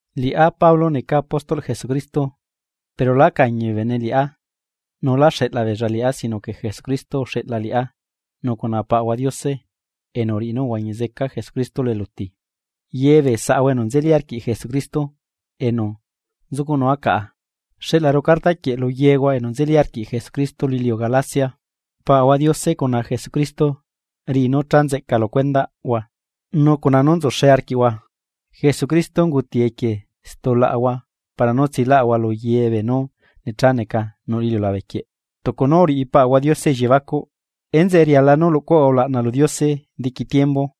Liꞌá, Pablo neca apóstol Jesucristo, pero lá cañi bee bene liꞌá, nu lá xeꞌla beella liꞌá sino que Jesucristo uxeꞌla liꞌá nu cuna Paꞌahua Diose enu uriꞌi nú uhuañi zeca Jesucristo lu eluti. Ye bee saꞌahua enu nzeli arquiꞌ Jesucristo enu nzucuꞌnua caꞌa xeꞌlaru carta quieꞌ lu yehua enu nzeli arquiꞌ Jesucristo lu iliu Galacia. Paꞌahua Diose cuna Jesucristo riꞌi nú cha nzeꞌca lu cuendaꞌhua nu cuna nú nzuxe arquiꞌhua. Jesucristo unguti equie stulaꞌahua para nú tsilaꞌahua lu ye beenú necha neca nuꞌ lu iliulabequieꞌ tucu nú uriꞌi Paꞌahua Diose elliebacuꞌ. ¡Enzeꞌe riala nú luꞌcuahua ulaꞌna lu Diose diqui tiembu!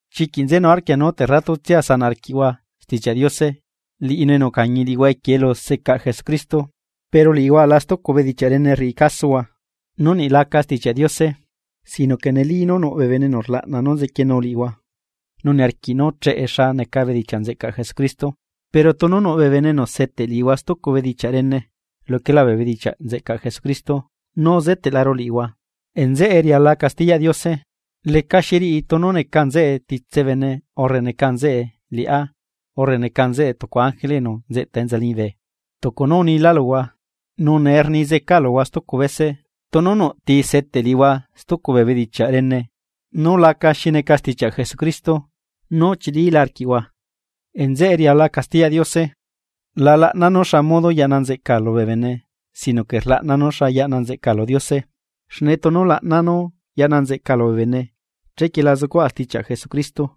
Chiquiꞌ nzenu arquia nú terratutsia sanaꞌ arquiꞌhua Stichiaꞌ Diose, liꞌinu enu ucañi liꞌihua equie elu secaꞌ Jesucristo. Pero liꞌihua aꞌla stucu bedichiaꞌ rene rriꞌi casohua, nú niꞌ laca sitichiaꞌ Diose. Sino que neli nú nuꞌ bee bene enu rlaꞌna nú zequienu liꞌihua nu niarquiꞌ nú cheꞌe xa neca bedichiaꞌ nzeꞌcaꞌ Jesucristo. Pero tunu nuꞌ bee bene enu seteꞌ liꞌihua stucu bedichiaꞌ rene luquelá bee bedichiaꞌ nzeꞌcaꞌ Jesucristo nú uzeteꞌlaru liꞌihua. Nzeꞌe riala castiyaꞌ Diose, lecaxiriꞌi tunu neca nzeꞌe titse bene urre neca nzeꞌe liꞌá urre neca nzeꞌe tucu ángele enu nzeꞌta enza liñibe. Tucu nú unilaa luhua, nu nee rni zeca luhua stucu bese: Tunu nuꞌti seteꞌ liꞌihua stucu bee bedichiaꞌ rene nú laca xi neca stichiaꞌ Jesucristo nú uchilila arquiꞌhua, nzeꞌe rialala castiyaꞌ Diose. La laꞌnaa nú xa modo yaꞌna nzeꞌca lubee bene sino que rlaꞌnaa nú yaꞌna nzeꞌca lu Diose. Xne tunu laꞌnaa nú yaꞌna nzeꞌcaa lubee bene chequie la zucuaꞌa stichiaꞌ Jesucristo.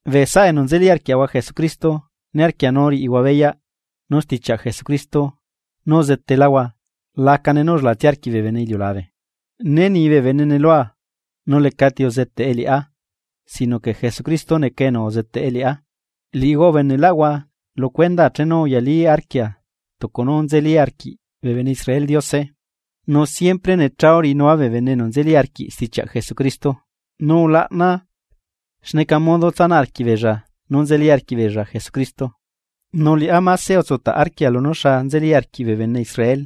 Bee saꞌa enu nzeli arquiaꞌahua Jesucristo niarquia nú riꞌihua beyaꞌ nú stichiaꞌ Jesucristo nú uzeteláhua lacane nú ullelatsia arquiꞌ bee bene iliulabe. Né ni bee benene lua nu lecati uzeteꞌe liꞌá sino que Jesucristo neca enu uzeteꞌe liꞌá. Liꞌihua ubeneꞌlaꞌhua lu cuendaa chenu uyalí arquia tucu nú nzeli arquiꞌ bee bene Israel Diose, nu siempre necha uriꞌinua bee bene enu nzeli arquiꞌ stichiaꞌ Jesucristo nu ulaꞌnaa xneca modo tsanaꞌ arquiꞌbeella nú nzeli arquiꞌbeella Jesucristo. Nu liꞌá máse utsutaꞌ arquia lunú xa nzeli arquiꞌ bee bene Israel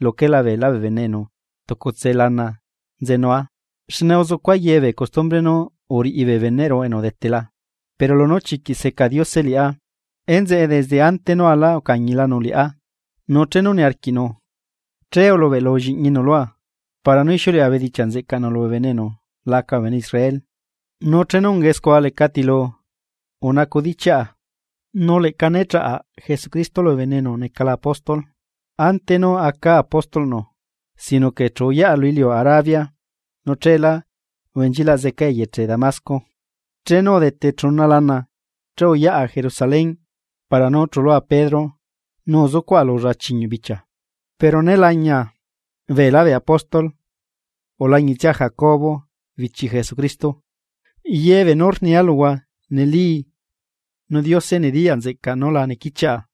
luquela beelá bee bene enu tucutse lana nzenua xne uzucua yebee costumbre nú uriꞌi bee beneꞌru enu udetela. Pero lunú chiquiꞌ seca Diose liꞌá, enzeꞌe desde ante nú alaa ucañilanu liꞌá. Nu chenu niarquiꞌnu, che ulubeꞌlu lliꞌñinu lua, para nú ixiuleꞌa bedichiaꞌ nzeꞌcaꞌnu lubee bene enu laca bee bene Israel. Nu chenu ungae scua lecatilu unacudichiaꞌa, nu leꞌca né chaꞌa Jesucristo lubee bene enu necala apóstol ante nú acaa apóstolꞌnu, sino que chu uyaꞌa lu iliu Arabia nu cheelá ubenchilaꞌ zeca eyeche Damasco. Chenu udete chuna lana che uyaꞌa Jerusalén para nú chulua Pedro nu uzucuaꞌa lulla chiñuꞌ bichia. Pero né lañia beelá bee apóstol ulañitsia Jacobo bichi Jesucristo. Ye beenú rnia luhua neli nu Diose nediyaꞌ nzeꞌcaꞌ nú la nequichiaꞌa.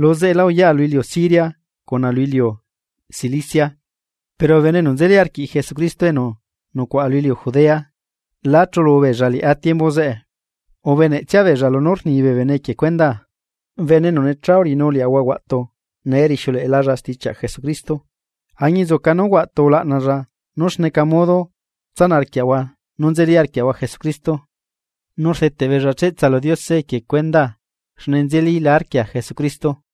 Luzeꞌelá uyaꞌa lu iliu Siria cuna lu iliu Cilicia. Pero bee bene enu nzeli arquiꞌ Jesucristo enu nucuaꞌa lu iliu Judea lá chulubeella liꞌá tiembu zeꞌe. Ubeneꞌtsia beella lunú rni bee bene equie cuendaa: “Bene enu necha uriꞌinu liaꞌahua huaꞌtu nee rixiuleꞌelalla stichiaꞌ Jesucristo añinzuca nú huaꞌtu ulaꞌnalla nú xneca modo tsanaꞌ arquiaꞌahua nú nzeli arquiaꞌahua Jesucristo.” Nu rdeteꞌ beella cheꞌtsa lu Diose equie cuendaa xne nzelila arquia Jesucristo.